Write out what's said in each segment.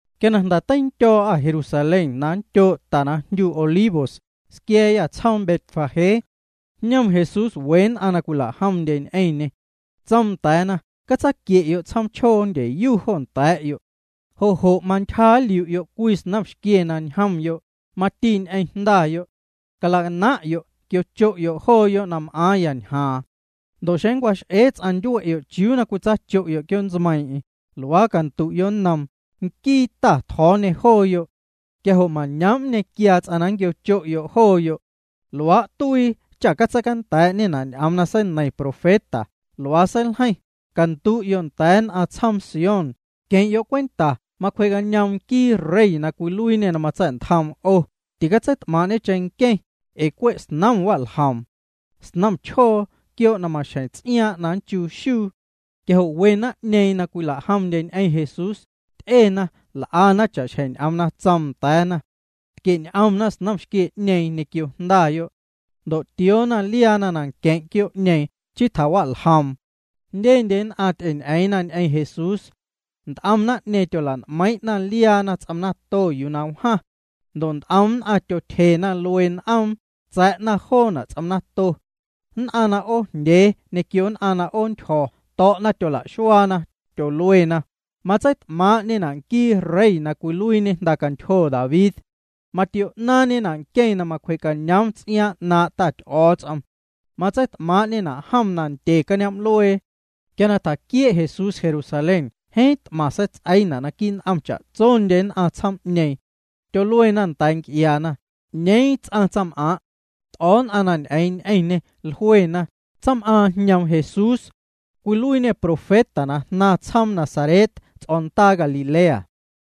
Quia na jnda̱ teindyo̱o̱'â Jerusalén, na nndyoo' ta na jndyu Olivos, squia̱a̱yâ tsjoom Betfagé. Jñom Jesús we nn'aⁿ na cwila'jomndye ñ'eⁿñê. Tsoom nda̱a̱na: —Catsaquie'yo' tsjoom chjoo ndyeyu jo nda̱a̱'yo'. Jo' jo' mantyja nliu'yo' cwii snomxquie na ñjomyo', mati ñ'eⁿ jndayo'. Calacanaⁿ'yo', quiocho'yo' jooyo' na m'aaⁿya ñjaaⁿ. Ndo' xeⁿ nncwax'ee ts'aⁿ ndyue'yo' chiuu na cwitsacho'yo' quioo' ntsmeiiⁿ'eⁿ, luaa candu'yo' nnoom: “Nquii Ta tjo̱o̱ñê jooyo'.” Quia jo' mañoom' nñequiaa ts'aⁿ na nquiocho'yo' jooyo'. Luaa' tuii cha catseicanda̱a̱'ñena' ñ'oom na seineiⁿ profeta, luaa seiljeiⁿ: Candu'yo' nda̱a̱ nn'aⁿ tsjoom Sión: “Queⁿ'yo' cwenta macwjee'cañoom nquii rey na cwiluiiñe na matsa̱'ntjom 'o, ticatseit'maaⁿ'ñe cheⁿnqueⁿ, ee cwe' snom wa'ljoom. Snom chjoo, quioo' na maxjeⁿ ts'iaaⁿ' na nnchuu xuu.” Quia jo' we naⁿ'ñeeⁿ na cwila'jomndye ñ'eⁿ Jesús, ty'ena, l'ana cha'xjeⁿ ñ'oom na tsoom nda̱a̱na. Tquie'ñ'omna snomxquie'ñeeⁿ ñequio jndayo'. Ndo' tioona liaana nanqueⁿ' quioo'ñeeⁿ, chii tjawa'ljoom. Jndyendye nn'aⁿ ty'eñ'eeⁿna ñ'eⁿ Jesús. Nt'om naⁿ'ñeeⁿ tyola'n'meiiⁿ'na liaana ts'om nato yuu na wjaⁿ. Ndo' nt'om nn'aⁿ tyotyje luee n'oom, tsa̱'na joona' ts'om nato. Nn'aⁿ na 'oojndyee ñequio nn'aⁿ na 'oontyjo̱ to̱'na tyola'xuaana, tyoluena: —Matseit'maaⁿ'ñena' nquii rey na cwiluiiñe jndacantyjo David. Matio'naaⁿñena' nqueⁿ na macwjee'cañoom ts'iaaⁿ 'naaⁿ' Ta Ty'o̱o̱ts'om. Matseit'maaⁿ'ñena' jom nandye cañoom'luee. Quia na tjaquiee' Jesús Jerusalén jeeⁿ t'maⁿ seits'eiina' naquii' n'om cha'tsondye nn'aⁿ tsjoom'ñeeⁿ. Tyoluena nda̱a̱ nc'iaana: —¿'Ñeeⁿ ts'aⁿ tsaⁿm'aaⁿ'? T'o̱o̱ nn'aⁿ na ñ'eeⁿ ñ'eⁿñê, jluena: —Tsaⁿm'aaⁿ jñoom Jesús. Cwiluiiñê profeta na jnaaⁿ tsjoom Nazaret ts'o̱ndaa Galilea.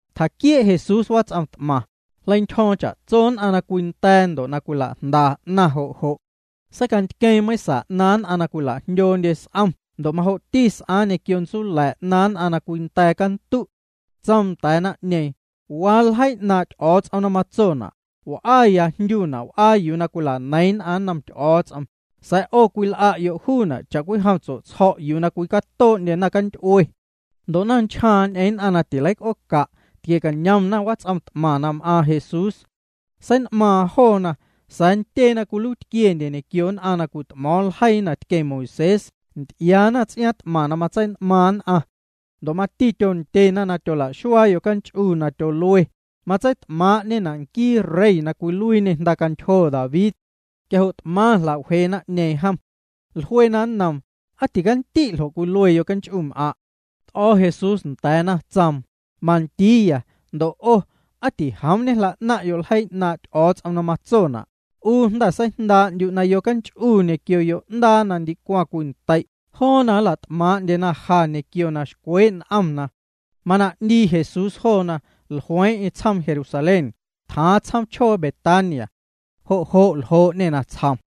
Tjaquiee' Jesús wats'om t'maⁿ, jleintyjo̱o̱ⁿ cha'tso nn'aⁿ na cwinda̱a̱ ndo' na cwila'jnda 'naⁿ jo' jo'. Seicantqueeⁿ meiⁿsa 'naaⁿ nn'aⁿ na cwila'jndyoondye s'om ndo' majo'ti s'aaⁿ ñequio ntsula̱ 'naaⁿ nn'aⁿ na cwinda̱a̱ cantu'. Tsoom nda̱a̱ naⁿ'ñeeⁿ: —Waa ljeii 'naaⁿ' Ty'o̱o̱ts'om na matsona': “W'aya jndyuna' w'aa yuu na cwila'neiⁿ nn'aⁿ nnom Ty'o̱o̱ts'om”, sa̱a̱ 'o cwil'a'yo' juuna' cha'cwijom tsue'tsjo̱' yuu na cwicatoo'ndye naⁿcanty'ue. Ndo' naⁿnchjaaⁿ ñ'eeⁿ nn'aⁿ na tileic'ooca', tquie'cañomna wats'om t'maⁿ na m'aaⁿ Jesús. Sein'maaⁿ joona. Sa̱a̱ ntyee na cwiluiitquiendye ñequio nn'aⁿ na cwit'mo̱o̱ⁿ ljeii na tqueⁿ Moisés nty'iaana ts'iaaⁿ t'maⁿ na matsein'maaⁿ nn'aⁿ. Ndo' mati tyondyena na tyolaxuaa yocanch'u na tyolue: “Matseit'maaⁿ'ñena' nquii rey na cwiluiiñe jndacantyjo David.” Quia jo' t'maⁿ jla'wjee naⁿ'ñeeⁿ jom. Jluena nnoom: —¿Aa ticandi' ljo' cwilue yocanch'um'aⁿ'? T'o̱ Jesús nda̱a̱na, tsoom: —Mandiiya. Ndo' 'o, aa tijoom ñejla'naⁿ'yo' ljeii 'naaⁿ' Ty'o̱o̱ts'om na matsona': 'U jnda̱ seijndaa'ndyu' na yonch'u ñequio yo'ndaa na ndicwaⁿ cwintei' joona nla't'maaⁿ'ndyena ja ñequio na xcwee' n'omna. Mana 'ndii Jesús joona, jlueeⁿ'eⁿ tsjoom Jerusalén, tjaaⁿ tsjoom chjoo Betania. Jo' jo' ljoo'ñê natsjom.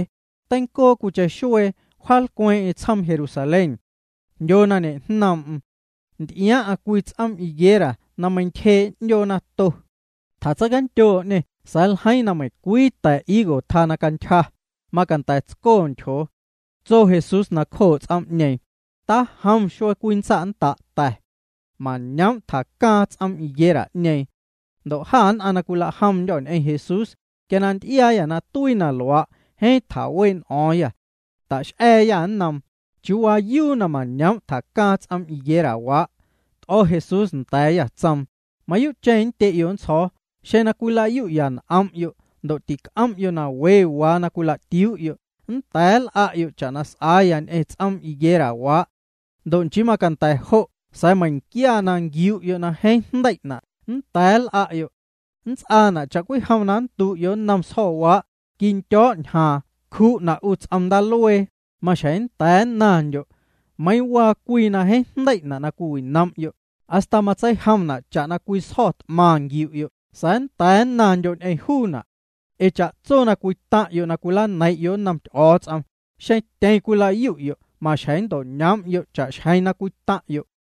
Teincoo cwiicheⁿ xuee wjaalcweeⁿ'eⁿ tsjoom Jerusalén. Jndyo na ñejnoom'm. Nty'iaaⁿ'aⁿ cwii ts'oom higuera na meintyjee' 'ndyoo nato. Tjatseicandyoo'ñê sa̱a̱ ljeiiⁿ na meiⁿcwii ta̱ higo tjaa na cantyja, macanda̱ tsco na ntyjoo. Tso Jesús nacjoo' ts'oom'ñeeⁿ: —Tajom xuee cwii nntsa'nnda' ta̱. Mañoom' tjacaaⁿ ts'oom higuera'ñeeⁿ. Ndo' jâ nn'aⁿ na cwilajomndyô̱ ñ'eⁿ Jesús, quia na nty'iaayâ na tuii na luaa', jeeⁿ tjawee' n'o̱o̱ⁿyâ. Tax'a̱a̱yâ nnoom: —¿Chiuu waayuu na mañoom' tjacaaⁿ ts'oom higuerawaa'? T'o̱ Jesús nda̱a̱yâ, tsoom: —Mayuu'cheⁿ nndye'yo' nntsjo̱o̱, xeⁿ na cwilayu'ya n'om'yo' ndo' tic'om'yo' na we waa na cwila'tiuu'yo', nnda̱a̱ nl'a'yo' cha'na s'aaya ñ'eⁿ ts'oom higuerawaa'. Ndo' nchii macanda̱ jo' sa̱a̱ meiⁿnquia na nquiu'yo' na jeeⁿ jndei'na' nnda̱a̱ nl'a'yo'. Nnts'aana' cha'cwijom na nndu'yo' nnom sjo̱waa': “Quindyo̱' ñjaaⁿ. Cju'na' 'u ts'om ndaaluee,” maxjeⁿ nnda̱a̱ nnaⁿndyo'. Meiiⁿ waa cwii na jeeⁿ jndei'na' na cwiwinom'yo', hasta matseijomna' cha'na cwii sjo̱ t'maⁿ nquiu'yo' sa̱a̱ nnda̱a̱ nnaⁿndyo' ñ'eⁿ juuna'. Ee cha'tso na cwitaⁿ'yo' na cwilaneiⁿ'yo' nnom Ty'o̱o̱ts'om, xeⁿ tyeⁿ cwilayu'yo', maxjeⁿ nnto'ñoom'yo' cha'xjeⁿ na cwitaⁿ'yo'.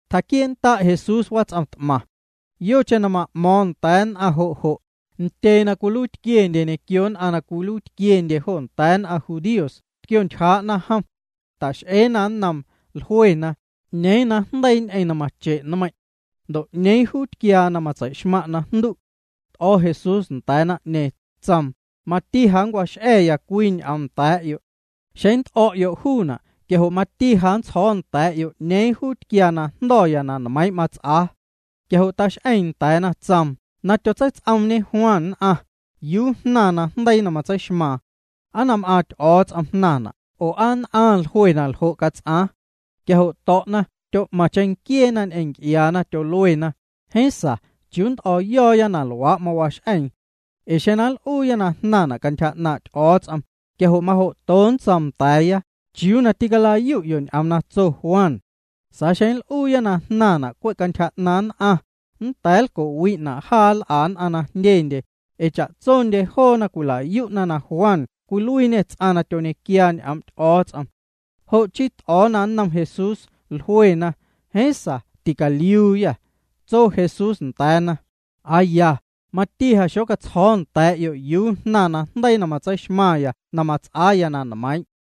Tjaquiee'nnda' Jesús wats'om t'maⁿ. Yocheⁿ na ma'mo̱o̱ⁿ nda̱a̱ nn'aⁿ jo' jo', ntyee na cwiluiitquiendye ñequio nn'aⁿ na cwiluiitquiendye jo nda̱a̱ nn'aⁿ judíos tquiontyjaa'na jom. Ta'x'eena nnoom, jluena: —¿'Ñeeⁿ najndeii ñ'eⁿ na mache' na nmeiiⁿ'? Ndo' ¿'ñeeⁿ juu tquiaa na matsei'xmaⁿ' najndu'? T'o̱ Jesús nda̱a̱ naⁿ'ñeeⁿ, tsoom: —Mati ja nncwax'a̱ya cwii ñ'oom nda̱a̱'yo'. Xeⁿ nnt'o̱'yo' juuna' quia jo' mati ja nntsjo̱o̱ nda̱a̱'yo' 'ñeeⁿ juu tquiaa najndo̱ na nmeiiⁿ' mats'aa. Quia jo' tax'eeⁿ nda̱a̱na, tsoom: —Na tyotseits'oomñe Juan nn'aⁿ, ¿yuu jnaⁿ najndeii na tyotseixmaaⁿ? ¿Aa na m'aaⁿ Ty'o̱o̱ts'om jnaⁿna' oo aa nn'aⁿ jlue na ljo' cats'aaⁿ? Quia jo' to̱'na, tyo'maⁿ cheⁿnquieena ñ'eⁿ nc'iaana, tyoluena: —Jeeⁿ sa ¿chiuu nnt'o̱o̱yo̱o̱ na luaa' mawax'eeⁿ? Ee xeⁿ nl'uuya na jnaⁿna' cantyja 'naaⁿ' Ty'o̱o̱ts'om, quia jo' majo'to nntsoom nda̱a̱ya: “¿Chiuu na tîcalayu'yo' ñ'oom na tso Juan?” Sa̱a̱ xeⁿ nl'uuya na jnaⁿna' cwe' cantyja 'naaⁿ nn'aⁿ, nnda̱a̱ nlco'wi'na' jaa nl'a nn'aⁿ na jndyendye, ee cha'tsondye joona cwila'yu'na na Juan cwiluiiñê ts'aⁿ na tyoñequiaa ñ'oom' Ty'o̱o̱ts'om. Jo' chii t'o̱o̱na nnom Jesús, jluena: —Jeeⁿ ticaliuuyâ. Tso Jesús nda̱a̱na: —Aa ya, mati ja xocatsjo̱o̱ nda̱a̱'yo' yuu jnaⁿ najndeii na matseixmaⁿya na s'aaya nmeiiⁿ'.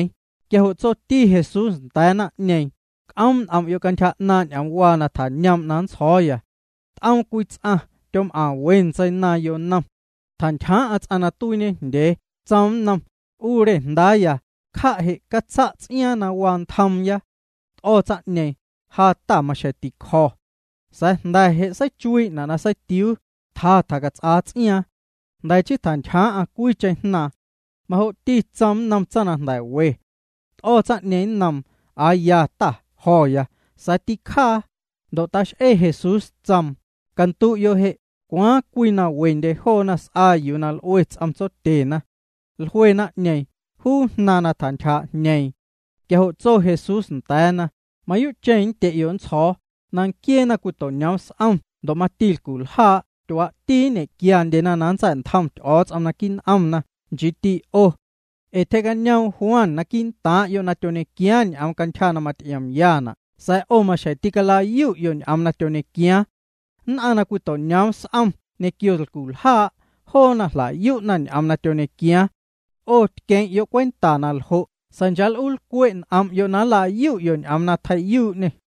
Quia jo' tsoti Jesús nda̱a̱ naⁿ'ñeeⁿ: —C'oom' n'om'yo' cantyja 'naaⁿ' ñ'oomwaa na tjañoom' na manntsjo̱o̱. T'oom cwii ts'aⁿ. Tyom'aⁿ we ntseinaaⁿ yonom. Tjantyjaaⁿ'aⁿ ts'aⁿ na tuiiñejndyee, tsoom nnom: “'U re jndaaya, cja' je' catsa' ts'iaaⁿ na waa ntjoomya.” T'o̱ tsaⁿ'ñeeⁿ, “Ja, ta, maxjeⁿ ticjo̱.” Sa̱a̱ jnda̱ je' seichuii'na' na seitiuu, tja tjacats'aa ts'iaaⁿ. Jnda̱ chii tjantyjaaⁿ'aⁿ cwiicheⁿ jnaaⁿ. Majo'ti tsoom nnom tsaⁿ na jnda̱ we. T'o̱ tsaⁿ'ñeeⁿ nnoom: “Aa ya, ta, jo̱ya.” Sa̱a̱ tîcjaa. Ndo' tax'ee Jesús, tsoom: —Candu'yo' je', ¿Cwaaⁿ cwii na wendye joona s'aa yuu na l'ue ts'om tsotyena? Jlue naⁿ'ñeeⁿ: —Juu jnaaⁿ na tjantyjaa'jñeeⁿ. Quia jo' tso Jesús nda̱a̱na: —Mayuu'cheⁿ nndye'yo' nntsjo̱o̱, na nquiee naⁿcwito'ñoom s'om ndo' mati lculjaa' tyuaa'ti nñe'quiandyena na nntsa̱'ntjom Ty'o̱o̱ts'om naquii' n'omna, nchiiti 'o. Ee tyjee'cañoom Juan quii'ntaaⁿ'yo' na tyoñequiaaⁿ ñ'oom cantyja na maty'iomyana' sa̱a̱ 'o maxjeⁿ tîcala'yu'yo' ñ'oom na tyoñequiaaⁿ. Nn'aⁿ na cwito'ñoom s'om ñequio lculjaa', joona jla'yu'na ñ'oom na tyoñequiaaⁿ. 'O tqueⁿ'yo' cwenta na ljo' sa̱a̱ chaa' l'uu lcwe' n'om'yo' na nlayu'yo' ñ'oom na tjei'yuu'ñê.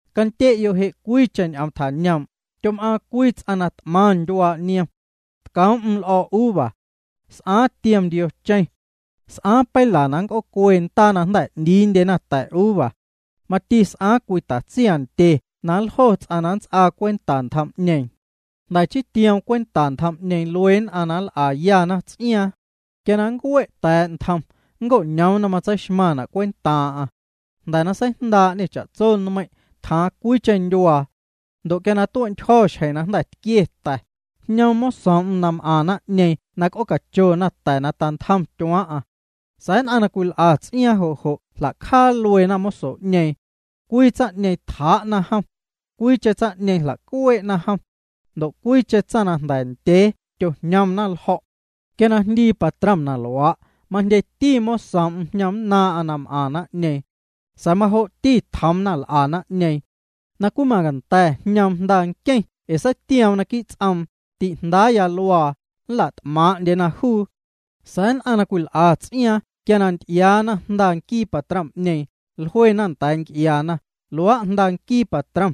’Candye'yo' je' cwiicheⁿ ñ'oom tjañoom': Tyom'aaⁿ cwii ts'aⁿ na t'maⁿ ndyuaa' niom. Tcoom'm l'o̱o̱ uva. S'aaⁿ tiom ndiocheⁿ. S'aaⁿ peila na nnc'oocue ndaa na jnda̱ 'ndiindyena ta̱uva. Mati s'aaⁿ cwii tatsiaⁿndye na nljo ts'aⁿ na nnts'aa cwenta ntjom'ñeeⁿ. Jnda̱ chii tioom cwenta ntjom'ñeeⁿ luee nn'aⁿ na nl'ayana ts'iaaⁿ. Quia na ncue' ta̱a̱' ntjom, nnco'ñoom na tseixmaⁿna' cwentaaⁿ'aⁿ. Jnda̱ na seijndaa'ñê cha'tso nmeiⁿ', tjaaⁿ cwiicheⁿ ndyuaa. Ndo' quia tue'ntyjo̱ xjeⁿ na jnda̱ tquie ta̱, jñoom mosoom'm na m'aⁿ naⁿ'ñeeⁿ na c'oocachona ta̱ na tantjom tyuaaⁿ'aⁿ. Sa̱a̱ nn'aⁿ na cwil'a ts'iaaⁿ jo' jo' jla'cjaa lueena moso'ñeeⁿ. Cwii tsaⁿ'ñeeⁿ tjaa'na jom. Cwiicheⁿ tsaⁿ'ñeeⁿ jlacuee'na jom. Ndo' cwiicheⁿ tsaⁿ na jnda̱ ndyee tyojñomna ljo̱'. Quia na jndii patrom na luaa', majndyeti mosoom'm jñomnnaaⁿ'aⁿ na m'aⁿ naⁿ'ñeeⁿ. Sa̱a̱ majo'ti tjoomna l'a naⁿ'ñeeⁿ. ’Na cwii macanda̱ jñoom jnda nqueⁿ ee seitioom naquii' ts'oom: “Ti'jndaaya luaa, nla't'maaⁿ'ndyena juu.” Sa̱a̱ nn'aⁿ na cwil'a ts'iaaⁿ quia nty'iaana jnda nquii patrom'ñeeⁿ, jluena nda̱a̱ nc'iaana: “Luaa' jnda nquii patrom.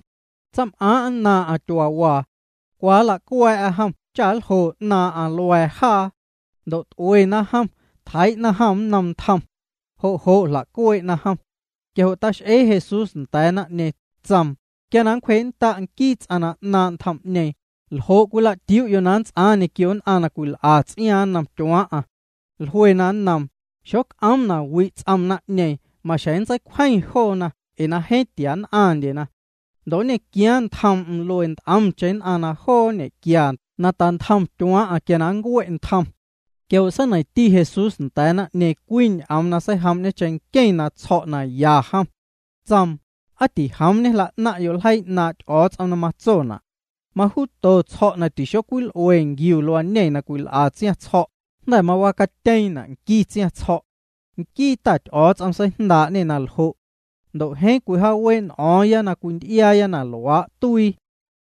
Tsaⁿm'aaⁿ' nnaaⁿ'aⁿ tyuaawaa. Cwa nlacua̱a̱'a jom cha nljo 'naaⁿ'aⁿ lua̱a̱ jaa.” Ndo' t'uena jom, tjeii'na jom nnom ntjom. Jo' jo' jla'cuee'na jom. Quia jo' tax'ee Jesús nda̱a̱ naⁿ'ñeeⁿ, tsoom: —Quia na nncwjee'nnda' nquii ts'aⁿ na 'naaⁿ' ntjom'ñeeⁿ, ¿ljo' cwilatiuu'yo' na nnts'aaⁿ ñequio nn'aⁿ na cwil'a ts'iaaⁿ nnom tyuaaⁿ'aⁿ? Jluena nnoom: —Xoc'oom na wi' ts'oom naⁿ'ñeeⁿ, maxjeⁿ nntseicwjeⁿ naⁿ'ñeeⁿ na jeeⁿ tia nn'aⁿndyena. Ndo' nñequiaaⁿ ntjoom'm luee nt'omcheⁿ nn'aⁿ na joo nñe'quia na tantjom tyuaaⁿ'aⁿ quia na nncue' ntjom. Quia jo' seineiⁿti Jesús nda̱a̱ naⁿ'ñeeⁿ cwii ñ'oom na seijoom'ñe cheⁿnqueⁿ na tsjo̱' na ya jom. Tsoom: —¿Aa tijoom ñejla'naⁿ'yo' ljeii 'naaⁿ' Ty'o̱o̱ts'om na matsona'?: Majuuto tsjo̱' na tixocwil'ue nquiu luañe na cwil'a tsiaⁿtsjo̱', jnda̱ mawacatyeeⁿna' nqui tsiaⁿtsjo̱'. Nquii Ta Ty'o̱o̱ts'om seijndaa'ñê na ljo'. Ndo' jeeⁿ cwijaawee' n'o̱o̱ⁿya na cwinty'iaaya na luaa' tuii.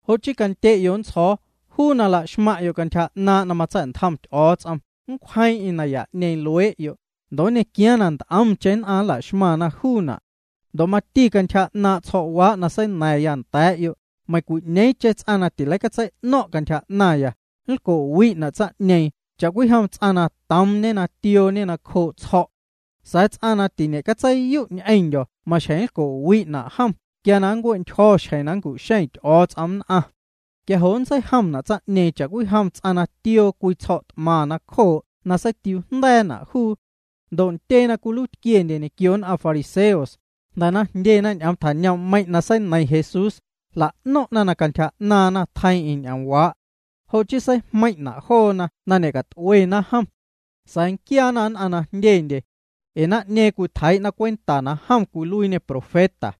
Jo' chii candye'yo' nntsjo̱o̱, juu na laxmaⁿ'yo' cantyja 'naaⁿ' na matsa̱'ntjom Ty'o̱o̱ts'om, nncwjeeⁿ'eⁿ naya'ñeeⁿ luee'yo', ndo' nñequiaaⁿ na nt'omcheⁿ nn'aⁿ nlaxmaⁿna juuna'. Ndo' mati cantyja 'naaⁿ' tsjo̱'waa' na seina̱ⁿya nda̱a̱'yo', meiⁿcwi'ñeeⁿcheⁿ ts'aⁿ na tileicatsei'no̱ⁿ' cantyja 'naⁿya, nlco'wi'na' tsaⁿ'ñeeⁿ cha'cwijom ts'aⁿ na toomñe na tiooñe nacjoo' tsjo̱'. Sa̱a̱ ts'aⁿ na tiñe'catseiyu' ñ'eⁿndyo̱ maxjeⁿ nlco'wi'na' jom quia na nncue'ntyjo̱ xjeⁿ na nncu'xeⁿ Ty'o̱o̱ts'om nn'aⁿ. Quia jo' nntseijomna' tsaⁿ'ñeeⁿ cha'cwijom ts'aⁿ na tioo cwii tsjo̱' t'maⁿ nacjoo' na seitiuujnda̱a̱na' juu. Ndo' ntyee na cwiluiitquiendye ñequio nn'aⁿ fariseos, jnda̱ na jndyena ñ'oom tjañoom'meiⁿ' na seineiⁿ Jesús, jla'no̱ⁿ'na na cantyja 'naaⁿna tjeiiⁿ'eⁿ ñ'oomwaa'. Jo' chii seijmeiⁿ'na' joona na ñe'cat'uena jom. Sa̱a̱ nquiaana nn'aⁿ na jndyendye. Ee naⁿ'ñeeⁿ cwitjeii'na cwenta na jom cwiluiiñê profeta.